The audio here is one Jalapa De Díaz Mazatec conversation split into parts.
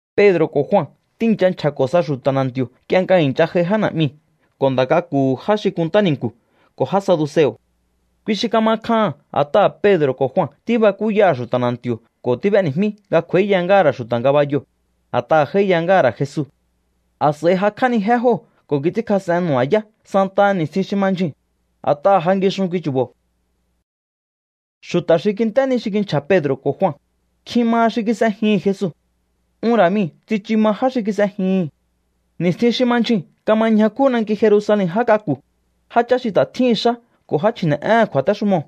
Pedro̱ ko̱ Jua tíi̱ncha nchja̱ko̱ sa xu̱ta̱ na̱nti̱o̱ nk'ie nga i̱ncha j'ai já na̱'miu̱ ko̱ nda̱ k'aku̱hu̱ já xi kunntá ni̱nku̱ ko̱ já saduseo̱. Kui xi kama kjaha̱n a̱t'aha̱ Pedro̱ ko̱ Jua tíbakúyaha̱ xu̱ta̱ na̱nti̱o̱ ko̱ tíb'éni̱jmí nga kj'u̱a̱íya ngáha̱ ra̱ xu̱ta̱ ngabayoo̱, a̱t'aha̱ j'áíya ngáha̱ ra̱ Jesu. A̱s'a̱i jakj'ánijé jóo̱ ko̱ kits'ínkjas'en nu̱ba̱yá santaha ni̱stjin xi ma ndyjuu̱n, a̱t'aha̱ ja ngixun kui chu̱bo̱. Xu̱ta̱ xi kint'é ni xi kinchja̱ Pedro̱ ko̱ Jua, nkjin maha xi kis'ejihi̱n Jesu. Un ra̱ mii̱ tsichu ma já xi kis'ejihi̱n. Ni̱stjin xi ma ndyjuu̱n kama ñjakú nanki Jerusalen já k'aku̱, jáchá xi ta̱ tjíhi̱n xá ko̱ já chji̱ne̱'éhe̱n kju̱a̱téxumoo̱.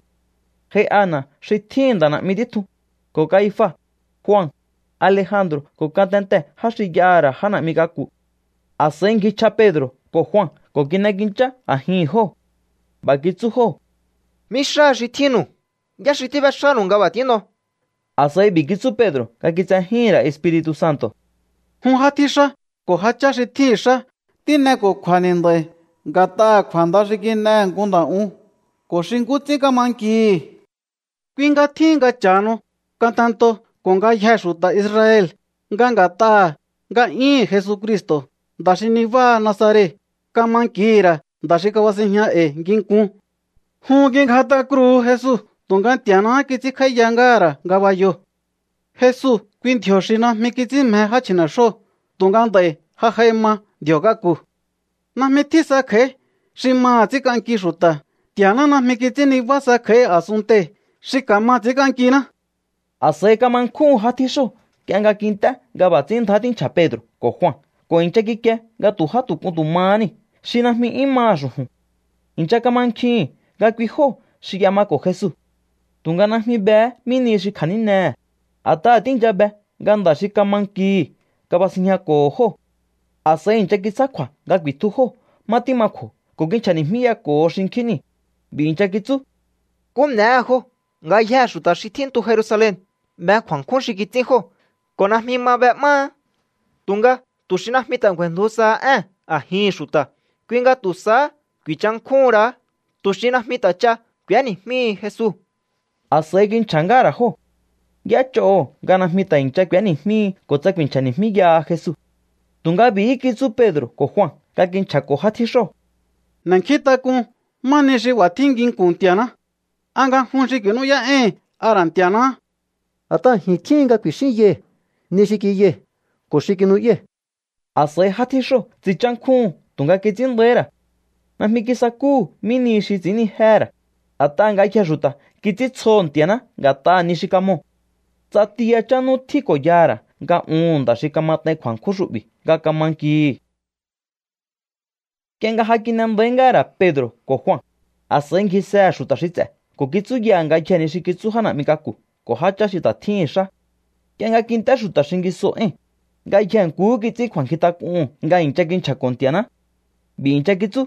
J'ai Ana xi tjíhi̱n nda̱ na̱'mi títjun, ko̱ Kaifa, Jua, Alejandro̱ ko̱ ngatentee̱ já xi y'aha̱ ra̱ já na̱'mi k'aku̱. A̱s'a̱i ngjichj'a Pedro̱ ko̱ Jua ko̱ kin'ekinchá a̱jihi̱n jóo̱. B'a̱ kitsú jóo̱: —¿Mí xáha xi tjínnu̱u? ¿Yá xi tíb'éxánu̱u nga b'a̱ tín'o? A̱s'a̱i b'i̱ kitsú Pedro̱ nga kitsejíhi̱n ra̱ Espiri̱tu̱ Santo̱: —Jun já tjíxá ko̱ jáchá xi tjíhi̱n xá, tín'eko̱kju̱a̱ni̱ nd'a̱i̱ nga̱t'aha̱ kju̱a̱nda xi kin'ehe̱ nku nda̱ un ko̱ xi nkú ts'ín kama nkihi̱. Kui nga tjíhin nga cha̱hanu ngatentoo̱ ko̱ ngayjee̱ xu̱ta̱ Israel nga nga̱t'aha̱ nga'yúhu̱n Jesucristo̱, nda̱ xi nibáha Nazaret, kama nkihi̱ ra̱ nda̱ xi kabasinjña e̱i̱ nginkun. Jun kingjat'a kruhu̱u Jesu tu̱nga Nti̱a̱náhá kits'ínkj'áíya ngáha̱ ra̱ ngabayoo̱. Jesu, kui ndji̱o̱ xi najmi kits'ín mje já chji̱ne̱xjóo̱ tu̱nga nd'a̱i̱ ja j'ai ma ndji̱o̱ k'aku̱. Najmi tjín sa kj'a̱í xi maha̱ ts'ínk'anki xu̱ta̱. Nti̱a̱ná najmi kits'ín nibá sa kj'a̱í a̱sunntei̱ xi ka̱ma ts'i̱ínk'ankiná. A̱s'a̱i kama nkjúhu̱n já tjíxóo̱ nk'ie nga kint'é nga b'a̱ ts'ín ndjá tínchja̱ Pedro̱ ko̱ Jua ko̱ i̱ncha kikie nga tu̱ já tu̱ k'un tu̱ mahá niu̱ xi najmi 'yún maha̱ xu̱ju̱n. I̱ncha kamankjihi̱n nga kui jóo̱ xi y'emako̱ Jesu. Tu̱nga najmi behé mí nihi xi kja̱nínehe̱, a̱t'aha̱ tíi̱ncha be nga nda̱ xi kama nkihi̱ kabasinjñako̱ho̱ jóo̱. A̱s'a̱i i̱ncha kitsjá kju̱a̱ nga ku̱i̱tju jóo̱ má tíma kju̱o̱ ko̱ kinchja̱ni̱jmíyako̱ho xinkjín niu̱. B'i̱ i̱ncha kitsú: —¿Nkú n'e̱éhe̱ jóo̱? Ngayjee̱ xu̱ta̱ xi tjíntu Jerusalen be kju̱a̱nkjún xi kits'ín jóo̱ ko̱ najmi ma b'e'máá. Tu̱nga tu̱ xi najmi ta̱ ngju̱a̱i̱ndju saha ée̱n a̱jihi̱n xu̱ta̱, kui nga tu̱ sahá ku̱i̱nchankjúhu̱n ra̱á tu̱ xi najmi ta̱ ch'a k'u̱éni̱jmíhi Jesu. A̱s'a̱i kinchja̱ ngáha̱ ra̱ jóo̱. Y'éch'oho̱ nga najmi ta̱ i̱ncha k'u̱éni̱jmíhi ko̱ tsa ku̱i̱nchja̱ni̱jmíyaha Jesu. Tu̱nga b'i̱hí kitsú Pedro̱ ko̱ Jua nga kinchja̱ko̱ já tjíxóo̱: —N'e̱nkjíntak'un má nihi xi b'a̱ tjín nginku̱n Nti̱a̱ná. ¿A nga jun xi ku̱i̱nú'yá'éi̱hi̱n a ra̱ Nti̱a̱náhá? A̱t'aha̱ ji̱n tjíhin nga ku̱i̱xínyai̱ ni xi kiyai̱ ko̱ xi kinu'yái̱. A̱s'a̱i já tjíxóo̱ tsinchánkjúhu̱n tu̱nga kits'ín nda̱íhí ra̱. Najmi kisakúhu̱ mí nihi xi ts'i̱ínnijéhe̱ ra̱, a̱t'aha̱ ngayjee̱ xu̱ta̱ kits'íntsjoho̱ Nti̱a̱ná nga̱t'aha̱ ni xi kamoo̱. Ts'ati yachán nú tjín ko̱ yaha̱ ra̱ nga uhu̱n nda̱ xi kamat'ain kju̱a̱nkjún xu'bi̱ nga kama nkihi̱. Nk'ie nga ja kin'e nda̱í ngáha̱ ra̱ Pedro̱ ko̱ Jua, a̱s'a̱i ngjisehe̱ xu̱ta̱ xi ts'e̱ ko̱ kitsúyaha̱ ngayjee̱ ni xi kitsú já na̱'mi k'aku̱ ko̱ jáchá xi ta̱ tjíhi̱n xá. Nk'ie nga kint'é xu̱ta̱ xingisoo̱ éi̱n, ngayjee̱ nkuhú kits'ín kju̱a̱nkjintak'uhu̱n nga i̱ncha kinchja̱ko̱ Nti̱a̱ná. B'i̱ i̱ncha kitsú: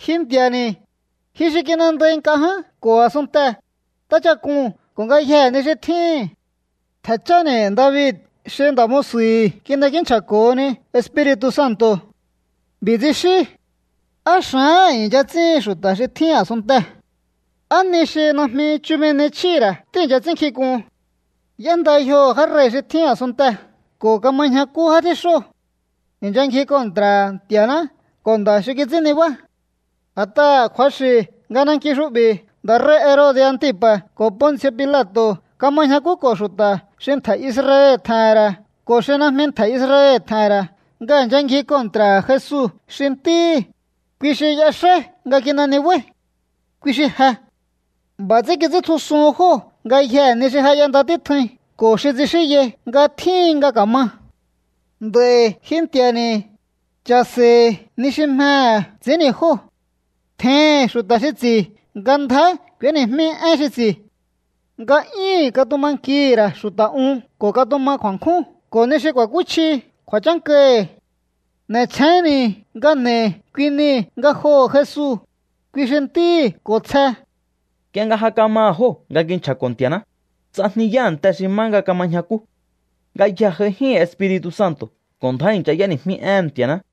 —Ji Nti̱a̱ni̱, ji xi kin'endai nk'a ján ko̱ a̱sunntee̱, ntáchak'uu̱n ko̱ ngayjee̱ ni xi tjíhín. Ntje̱ cháni̱ David xi nda̱ musu̱hi̱ kin'ekínchja̱ko̱honi Espiri̱tu̱ Santo̱. B'i̱ tsixín: ¿Á xa̱áha̱n i̱ncha ts'íhin xu̱ta̱ xi tjíhin a̱sunntee̱? ¿Á ni xi najmi chumi ni chjíhi̱ ra̱ tíi̱ncha ts'ínnkjin k'uhun? Y'énda yjoho̱ já rei̱ xi tjín a̱sunntee̱ ko̱ kama ñjakú já tjíxóo̱. I̱ncha ngji kontra̱ha̱ Nti̱a̱ná ko̱ nda̱ xi kits'ín nibá. ’A̱t'aha̱ kju̱axi̱ nga nanki xu'bi̱ nda̱ rei̱ Herode̱ Antipa̱ ko̱ Ponci̱o̱ Pilato̱ kama ñjakúko̱ xu̱ta̱ xi ntje̱ Israel tje̱he̱n ra̱ ko̱ xi najmi ntje̱ Israel tje̱he̱n ra̱ nga i̱ncha ngji kontra̱ha̱ Jesu xi Ntíhi̱, kui xi y'exáí nga kin'e nibáí. Kui xi je. B'a̱ ts'ín kits'íntjusuhun jóo̱ ngayjee̱ ni xi ja y'enda títjuin ko̱ xi tsixínyai nga tjíhin nga ka̱ma. ’Nd'a̱i̱ ji Nti̱a̱ni̱, cha̱se̱i̱hi̱ ni xi mjehe̱ ts'i̱ínni̱ jóo̱. Tjeihi̱n xu̱ta̱ xi ts'i̱ nga ndjá k'u̱éni̱jmí én xi ts'i̱. Nga'yíhi̱n katuma nkihi̱ ra̱ xu̱ta̱ un ko̱ katuma kju̱a̱nkjún ko̱ ni xi ku̱a̱kúchji kju̱a̱chánkahi̱. N'e̱chjénni̱ nga n'e̱i̱ kui niu̱ ngajoho̱ Jesu, kui xi Ntíhi̱ ko̱ tsje. Nk'ie nga ja kamaha̱ jóo̱ nga kinchja̱ko̱ Nti̱a̱ná, ts'ajniyá a̱nte xi má nga kama ñjakú. Ngayjee̱ j'aijíhi̱n Espiri̱tu̱ Santo̱ ko̱ ndjá i̱ncha y'éni̱jmí éhe̱n Nti̱a̱ná.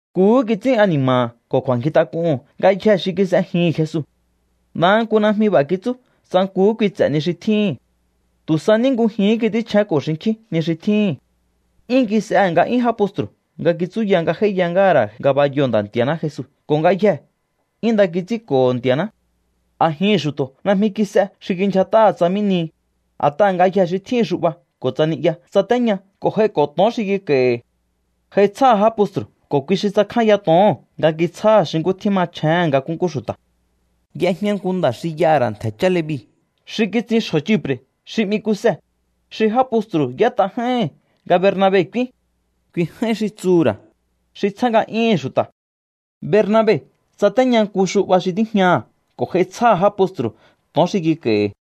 Nkuhú kits'ín ani̱ma̱ha̱ ko̱ kju̱a̱nkjintak'uhu̱n ngayjee̱ xi kis'ejihi̱n Jesu. Ndaha nku najmi b'a̱ kitsú tsa nkuhú kui ts'e̱ ni xi tjíhi̱n. Tu̱ sa ní ngujihín kits'ínchjénko̱ xinkjín ni xi tjíhi̱n. 'Yún kis'ehe̱ nga'yún já postru̱ nga kitsúya nga j'áíya ngáha̱ ra̱ ngabayoo̱ Nda̱ Nti̱a̱ná Jesu ko̱ ngayjee̱ 'yún nda kits'ínko̱ho̱ Nti̱a̱ná. A̱jihi̱n xu̱to̱ najmi kis'e xi kindyjat'aha̱ tsa mí nihi, a̱t'aha̱ ngayjee̱ xi tjíhi̱n xu'ba ko̱ tsa ni'ya tsatéña ko̱ j'aiko̱ to̱on xi kik'a̱i̱hi̱. J'ai tsjáha̱ já postru̱ ko̱ kui xi tsakjánya to̱oo̱n nga kitsjáha̱ xi nkú tjín machjéhe̱n nga nkúnkú xu̱ta̱. Y'ejña nku nda̱ xi y'aha̱ ra̱ ntje̱ chá Levi xi kitsin xjo̱ Chipre̱ xi 'mi Kuse, xi já postru̱ y'ét'a j'áíhi̱n nga Bernabe k'úín. Kui j'áín xi tsuhu̱ ra̱: xi tsjá nga'yúhu̱n xu̱ta̱. Bernabe tsatéña nku xu'ba xi tíjñaha̱ ko̱ j'ai tsjáha̱ já postru̱ to̱on xi kik'a̱i̱hi̱.